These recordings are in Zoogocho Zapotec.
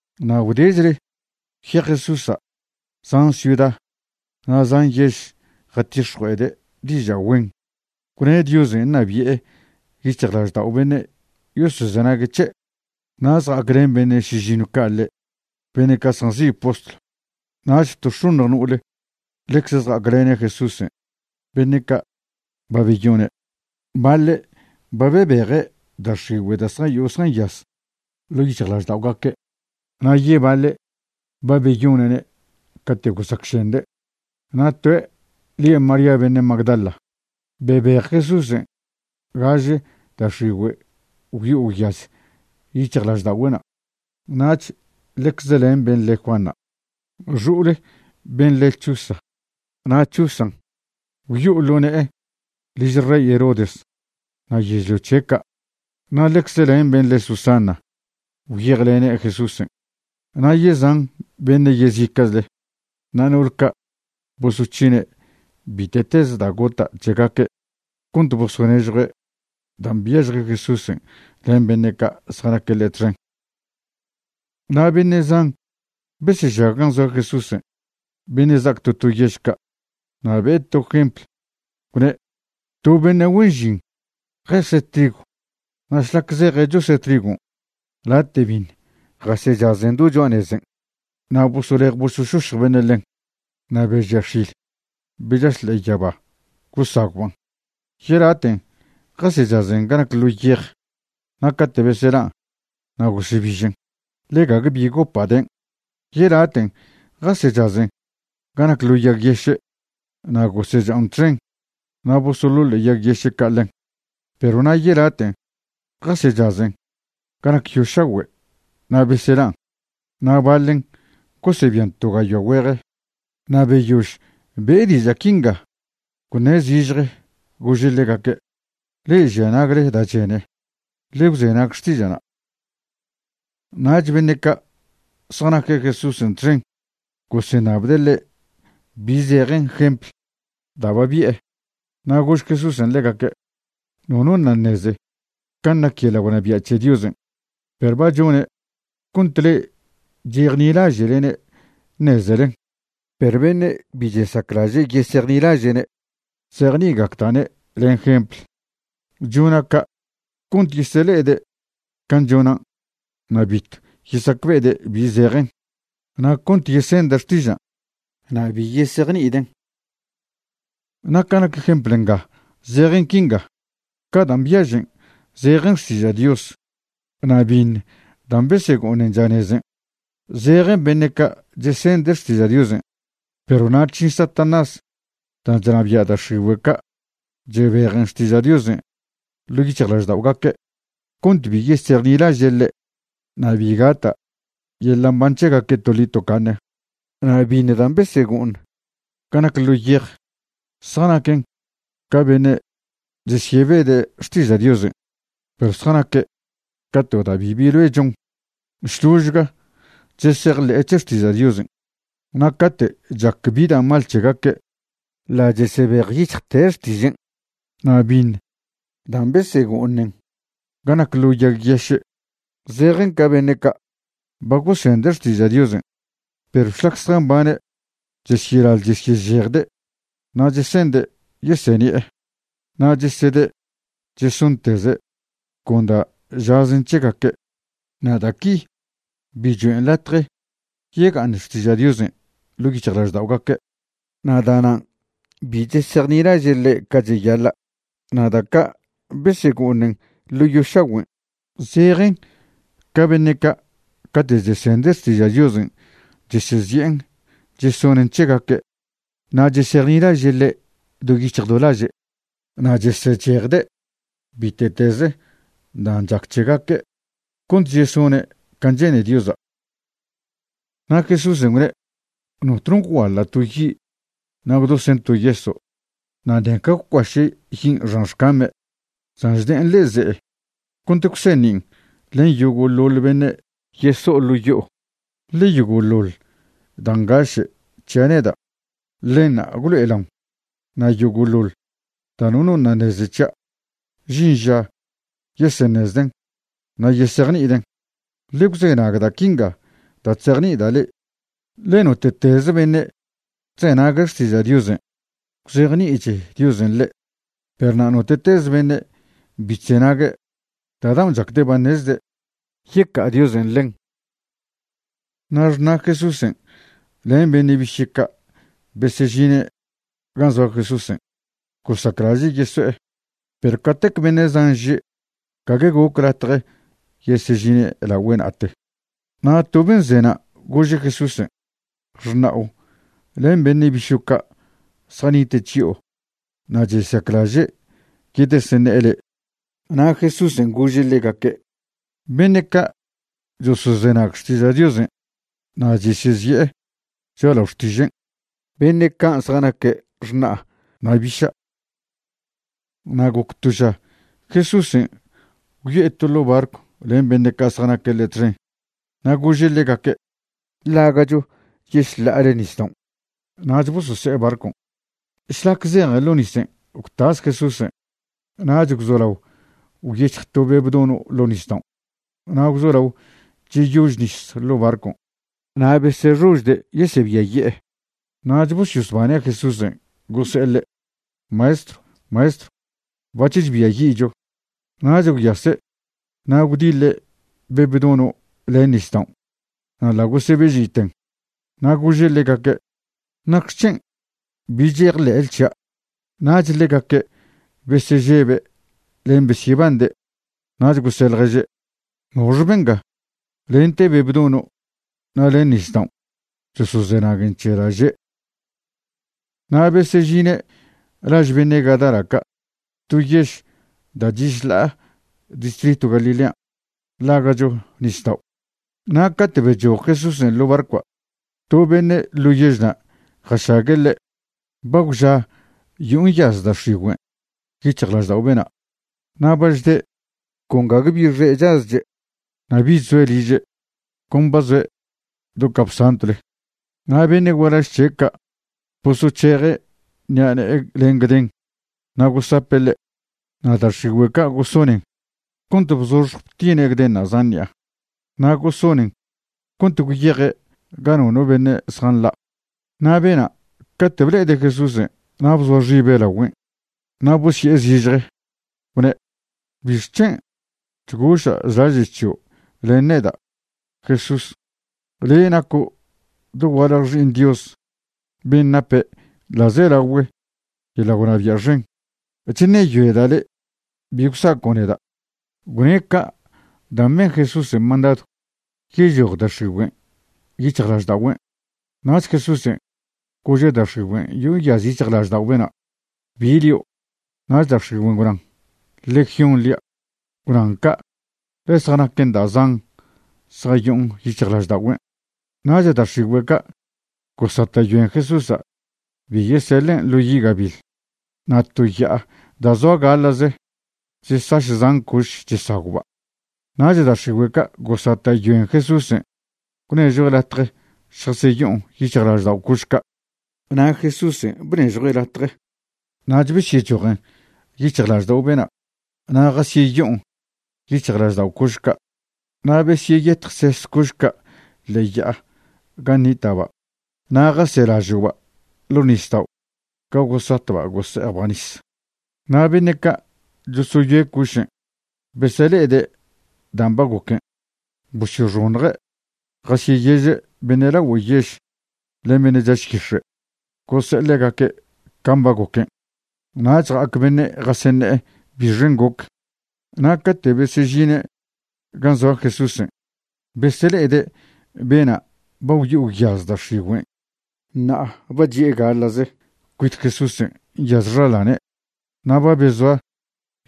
Na' gwdechle gwyej Jesúsa' zan ciuda na' zan yež jatix̱jue'ede' diža' güen, gwne' Diosen' ṉabi'e yic̱hjlaždao' beṉe' yosozenague' c̱he'. Na' zja'aclen beṉe' šižiṉw ca' ḻe', beṉe' ca' zjanzi' postlw. Nach to x̱oṉj no'ole ḻecze zja'aclene' Jesúsen' beṉe' ca' ba beyone'. Baḻe' ba bebeje' da' x̱igüe' da' zjayo'o zjanyaz ḻo' yic̱hjlažda'ogaque' na' yebaḻe' ba beyone'ne' cate' gosacšende'. Na' toe' lie' María beṉe' Magdala, bebej Jesúsen' gaže da' x̱igüe' gwyo'o gwyaz yic̱hjlažda'ogüe'na'. Nach ḻecze len ben' le Juana, xo'ole ben' le Chuza, na' Chuzan', gwyo'o ḻo ne'e liž rey Herodes na' yežlio c̱he' ca'. Na' ḻecze len ben' le Susana gwyejlene' Jesúsen', na' yezan beṉe' yezica'chle. Na' no'ol ca' bosoc̱hine' bite'teze da' gota' c̱hegaque' cont bosonežjue' dan' byažje Jesúsen' len beṉe' ca' zjanaque' ḻe' txen. Na' beṉe' zan besežag gan' zoa Jesúsen' beṉe' za'ac to to yež ca'. Na' be'e to jempl, gwne': ―To beṉe' güen žin jeze' trigw na' šlac zeje' chose' trigon' late' biṉ jasechazen do cho'a nezen', na' bosolej bosošošj beṉe' ḻen, na' be žia x̱il be chaš ḻe'e yaba gosagwban'. Yelaten' jasechazen ga nac ḻo yej, na' cate' beselan' na' gosebižen, ḻe gague bi gopa' den'. Yelaten' jasechazen ga nac ḻo yag yeše', na' gosecha'on txen, na' bosoḻoḻe' yag yeše' ca' ḻen. Perw na' yelaten' jasechazen ga nac yo šagüe' na' beselan', na' baḻen gosebian to gayoa güeje. Na' beyož be'e diža' quinga gwṉe' zižje gože' ḻegaque': ―Le'e žia nagle da' chene, ḻe gwzenag xtiža'na'. Nach beṉe' ca' zjanaque' Jesúsen' txen goseṉabde' ḻe' bi zejen jempl da' ba bi'e. Na' gož Jesúsen' ḻegaque': ―Nono ṉa' neze can' nac yeḻa' gwnabia' c̱he Diosen'. Perw ba chone' cont le'e chejnilaže'lene' ṉezelen. Perw beṉe' bi chesaclaže' yesejnilaže'ne', chzejni'igacda'ne' len jempl. Chona' ca' cont yesele'ede' can' chonan' na' bitw yesacbe'ede' bi zejen, na' cont yesende' xtižan' na' bi yesejni'iden'. ’Na' ca nac jempl nga zejen quinga: Ca dan' byažen zejen xtiža' Dios. Na' biṉ dan' besego'oṉen chanezen', zejen beṉe' ca' chesende' xtiža' Diosen', perw na' chžin Satanás dan' chnabia' da' x̱igüe' ca' chebejen xtiža' Diosen' ḻo' yic̱hjlažda'ogaque' cont bi yesejnilaže' ḻe' na' bi gata' yeḻa' mban c̱hegaque' toḻi tocaṉe. Na' biṉ dan' besego'oṉ ga nac ḻo yej zjanaquen ca beṉe' chesyebede' xtiža' Diosen', perw zjanaque' ca to da' bibi loe chon, šložga chesejḻe'e c̱he xtiža' Diosen', na' cate' chac bi da' mal c̱hegaque' ḻa' chesebejyic̱hjte' xtižen'. Na' biṉ dan' besego'oṉen ga nac ḻo yag yeše', zejen ca beṉe' ca' ba gosende' xtiža' Diosen', perw šlac zjambane' chesyelaḻ chesyežejde' na' chese'nde' yeseṉi'e, na' chesede' chesonteze' con da' žazen c̱hegaque'. Na' da' qui bi choen' latje yega'aṉ xtiža' Diosen' ḻo' yic̱hjlažda'ogaque' na' da'nan' bi chesejnilaže' ḻe' ca cheyaḻa'. Na' da' ca' besego'oṉen ḻo yo šagüen', zejen ca beṉe' cate' chesende' xtiža' Diosen' chesezi'en chesonen' c̱hegaque', na' chesejnilaže' ḻe' do yic̱hj do laže', na' chesechejde' bite'tez dan' chac c̱hegaque' cont chesone' can' che'ne Diosa'. Na' Jesúsen' gwne': ―Notno gwguaḻa' to yi' na' gwdosen' to yeso', na' ṉeca gwcuaše' yin' xan xcame'. San chde'en ḻe'e ze'e cont gwseṉin' len yogo'ḻoḻ beṉe' yeso'o ḻo' yo'o. Ḻe yogo'ḻoḻ da' ngaše' c̱hia' neda', ḻenṉa' gwlo'elaon, na' yogo'ḻoḻ da' nono ṉa' ṉeze c̱hia', žin ža yeseṉezden' na' yesejni'iden'. ’Ḻe gwzenag da' quinga da' chzejni'ida' le'e, ḻe note'teze beṉe' chzenague' xtiža' Diosen' gwzejni'ich Diosen' ḻe', perw na' note'teze beṉe' bi chzenague', da' daon' chacde' ba ṉezde', yeca'a Diosen' ḻen. Na' xṉa' Jesúsen' len beṉe' biše' ca' besežine' gan' zoa Jesúsen', gosaclaže' yeso'e, perw catec beṉe' zan že' gague goc latje yesežine' lagüe' na'ate. Na' to ben' ze na' gože' Jesúsen': ―Xṉa'o len beṉe' bišo' ca' zjanite' chyo'o na' chesaclaže' yedeseṉe'e le'e. Na' Jesúsen' gože' ḻegaque': ―Beṉe' ca' chosozenag xtiža' Diosen' na' chesezi'e cho'alao xtižen', beṉe' can' zjanaque' xṉa'a na' biša'. Na' goc to ža Jesúsen' gwyo'e to ḻo barcw len beṉe' ca' zjanaque' ḻe' txen. Na' gože' ḻegaque': ―Ḻaga'cho yešḻa'ale nisdaon'. Nach bosose'e barcon'. Šlac zejen ḻo nisen' gwtas Jesúsen'. Nach gwzolao gwyec̱hj to be' bdono' ḻo nisdaon', na' gwzolao cheyož nis ḻo' barcon'. Na' besexožde' yesebiaye'e. Nach bosyosbane' Jesúsen' gose'e ḻe': ―¡Maestrw! ¡Maestrw! Bac̱h chbiayi'cho. Nach gwyase' na' gwdiḻe' be' bdono' len nisdaon', na' ḻa' gosebe'žiten. Na' gože' ḻegaque': ―¿Nacxec̱hen' bi chejḻe'le c̱hia'? Nach ḻegaque' besežebe' len besyebande'. Nach gose' ḻježe': ―¿Noxe benga? lente be' bdono' na' len nisdaon' chosozenaguen c̱he da' že'. Na' besežine' laž beṉe' Gadara ca', to yež da' chi' šḻa'a distritw Galilean', ḻaga'cho nisdao'. Na' cate' bechoj Jesúsen' ḻo' barcoa', to beṉe' ḻo yežna' jašague' ḻe'. Ba gwža yo'o nyaz da' x̱igüen' yic̱hjlaždao' bena'. Na' ba chde' con gague bi xe' chazche', na' bich zoe' liže', con ba zoe' do capsantwle. Na' beṉe' gualaž c̱he' ca' bosoc̱heje' ṉi'a ne'e len gden na' gosape' ḻe'. Na' da' x̱igüe' ca' gosonen cont bzoxj btine' gdenṉa' zan ṉi'a. Na' gosonen cont gwyeje' ga nono beṉe' zjanḻa'. Na' bena' cate' ble'ede' Jesúsen' na' bzoa xibe' lagüen'. Na' bosye'e zižje gwne': ―¿Bixc̱hen' chgoša' chlaže' c̱hio' len neda', Jesús? Le' naco' dogualje Xi'iṉ Dios ben' nape' ḻa'zelagüe' yeḻa' gwnabia' xen. Chṉeyoeda' le' bi gwsaco' neda'. Gwne' ca' dan' ben Jesúsen' mandadw yechoj da' x̱igüen' yic̱hjlažda'ogüen'. Nach Jesúsen' gože' da' x̱igüen' yo'o nyaz yic̱hjlaždao' bena': ―¿Bi lio'? Nach da' x̱igüen' gwnan: ―Legión lia'. Gwnan ca' ḻe zjanaquen da' zan zjayo'on yic̱hjlažda'ogüen'. Nach da' x̱igüe' ca' gosata'yoen Jesúsa' bi yeseḻen' ḻo yi' gabiḻ. Na' to ya'a da' zoa gaḻa'ze chesaš zan coš chesagwba'. Nach da' x̱igüe' ca' gosata'yoen Jesúsen' gwnežjue' latje šjaseyo'on yic̱hjlaždao' coš ca'. Na' Jesúsen' bnežjue' latje. Nach besyechojen yic̱hjlaždao' bena' na' jaseyo'on yic̱hjlaždao' coš ca'. Na' besyeyetjses coš ca' ḻe'e ya'a gan' nita'ba' na' jaselažo'ba' ḻo' nisdao' ga gosatba' gose'ejba' nis. Na' beṉe' ca' chosoyoe' cošen' besele'ede' dan' ba goquen' bosyoxoṉje' jasyeyeže' beṉe' lagüe yež len beṉe' chaš yix̱e', gose'e ḻegaque' can' ba goquen. Nach ja'ac beṉe' jaseṉe'e bixen' goc. Na' cate' besežine' gan' zoa Jesúsen' besele'ede' bena' ba gwyo'o gwyaz da' x̱igüen', ṉa'a ba chi'e gaḻa'ze cuit Jesúsen' nyaz xaḻane', na' ba bezoa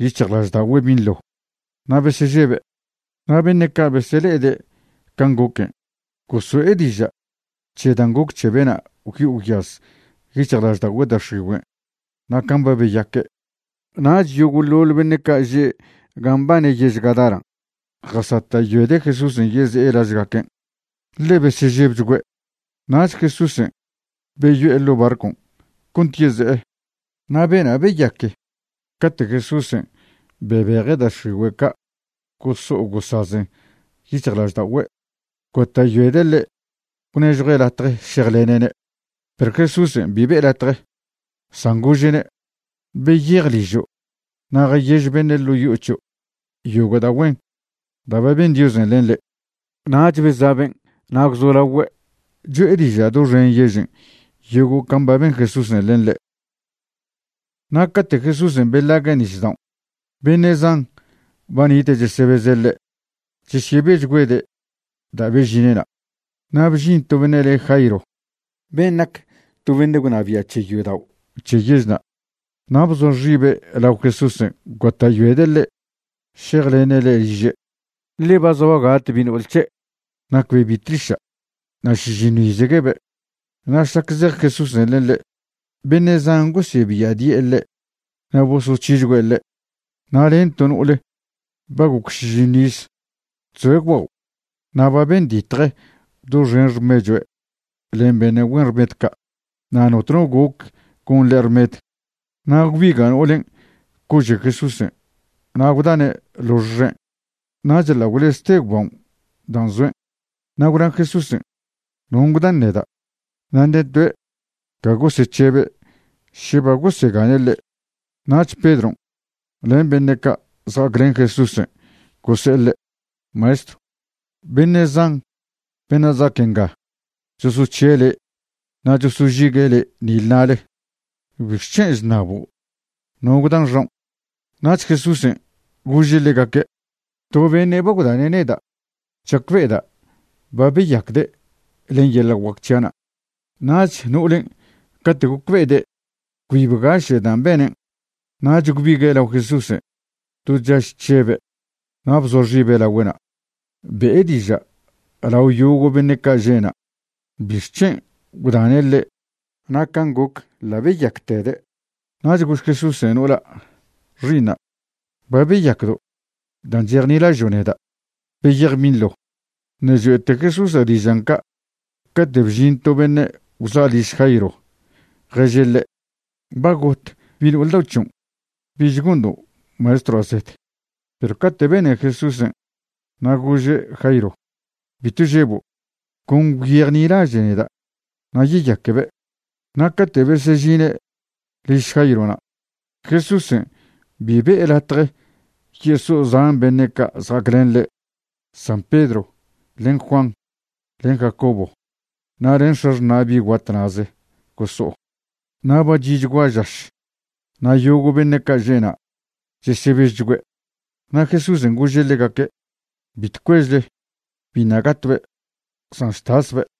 yic̱hjlažda'ogüe' binḻo. Na' besežebe'. Na' beṉe' ca' besele'ede' can' goquen' goso'e diža' c̱he dan' goc c̱he bena' gwyo'o gwyaz yic̱hjlažda'ogüe' da' x̱igüen' na' can' ba beyaque'. Nach yogo'ḻoḻ beṉe' ca' že' gan' mbane yež Gadaran' jaseta'yoede' Jesúsen' yeze'e lažgaquen', ḻe besežebchgüe'. Nach Jesúsen' beyo'e ḻo' barcon' cont yeze'e. Na' bena' beyaque cate' Jesúsen' bebeje' da' x̱igüe' ca' goso'o gosazen yic̱hjlažda'ogüe', gota'yoede' ḻe' gwnežjue' latje šejlene'ne'. Perw Jesúsen' bi be'e latje, san gože'ne': ―Beyej ližo' na' jayež beṉe' ḻo' yo'o c̱hio' yogo' da' güen da' ba ben Diosen' len le'. Nach beza' ben' na' gwzolagüe' cho'e diža' doxen yežen' yogo' can' ba ben Jesúsen' len ḻe'. Na' cate' Jesúsen' beḻague' nisdaon', beṉe' zan ba nita' chesebeze' ḻe'. Chesyebechgüede' da' bežine' na'. Na' bžin to beṉe' le' Jairo, ben' nac to beṉe' gwnabia' c̱he yodao' c̱he yežna'. Na' bzoa xibe' lao Jesúsen' gota'yoede' ḻe' šejlene' ḻe' liže', ḻe ba zoa gat bi' no'ol c̱he'. Nacbe' bi' tliša', na' šižiṉw izguebe'. Na' šlac zej Jesúsen' len ḻe', beṉe' zan gosebiadi'e ḻe' na' bosoc̱hichgüe' ḻe'. Na' len to no'ole ba goc šižiṉw iz chzoe' gwbao' na' ba benditje doxen xmechue' len beṉe' güen rmed ca'. Na' notno goc gon ḻe' rmed. Na' gwbiga' no'olen' cože' Jesúsen' na' gwdane' lox xen', nach ḻa' gwlezte gwbao' dan' zoen'. Na' gwna Jesúsen': ―¿Non' gwdan neda'? Na' ṉe toe' ca gosec̱hebe' še ba gosegane' ḻe'. Nach Pedron' len beṉe' ca' zja'aclen Jesúsen' gose'e ḻe': ―Maestrw, beṉe' zan beṉe' za'ac nga chosoc̱hie' le' na' chosožigue' le' nile na'le. ¿Bixc̱hen' chṉabo' no gwdan xaon'? Nach Jesúsen' gože' ḻegaque': ―To beṉe' ba gwdane' neda'. Chacbe'eda' ba beyacde' len yeḻa' guac c̱hia'na'. Nach no'olen' cate' gocbe'ede' cbi bgaše' dan' benen', nach gwbigue' lao Jesúsen' do chaž chžebe' na' bzoa xibe' lagüe'na', be'e diža' lao yogo' beṉe' ca' že'na' bixc̱hen' gwdane' ḻe' na' can' goc ḻa' beyactede'. Nach gož Jesúsa' no'ola': ―Xi'iṉa', ba beyacdo' dan' chejnilažo' neda'. Beyej binḻo. Ṉe' choe'te Jesúsa' dižan' ca' cate' bžin to beṉe' gwza' liž Jairo ježe' ḻe': ―Ba got bi' no'ol dao' c̱hion'. Bich gondo' Maestroa' zed. Perw cate' bene Jesúsen', na' gože' Jairo: ―Bitw žebo', con gwyejnilaže' neda' na' yeyaquebe'. Na' cate' besežine' liž Jairona', Jesúsen' bi be'e latje yeso'o zan beṉe' ca' zja'aclen ḻe', san Pedro, len Juan, len Jacobo, na' len x̱axṉa' bi' guat na'ze goso'o. Na' ba chi'chgua žaš na' yogo' beṉe' ca' že'na' chesebežchgüe'. Na' Jesúsen' gože' ḻegaque': ―Bitw cuežle. Biṉa' gatbe', san chtasbe'.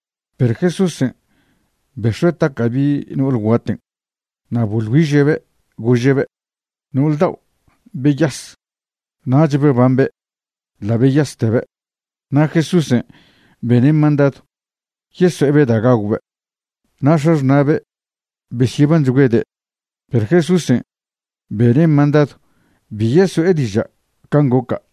Perw Jesúsen' bex̱ue' taca' bi' no'ol guaten' na' boḻ güiže'be' gože'be': ―No'ol dao', beyas. Nach bebambe', ḻa' beyastebe'. Na' Jesúsen' bene' mandadw yeso'ebe' da' gagwbe'. Na' x̱axṉa'be' besyebanchgüede'. Perw Jesúsen' bene' mandadw bi yeso'e diža' can' goca'.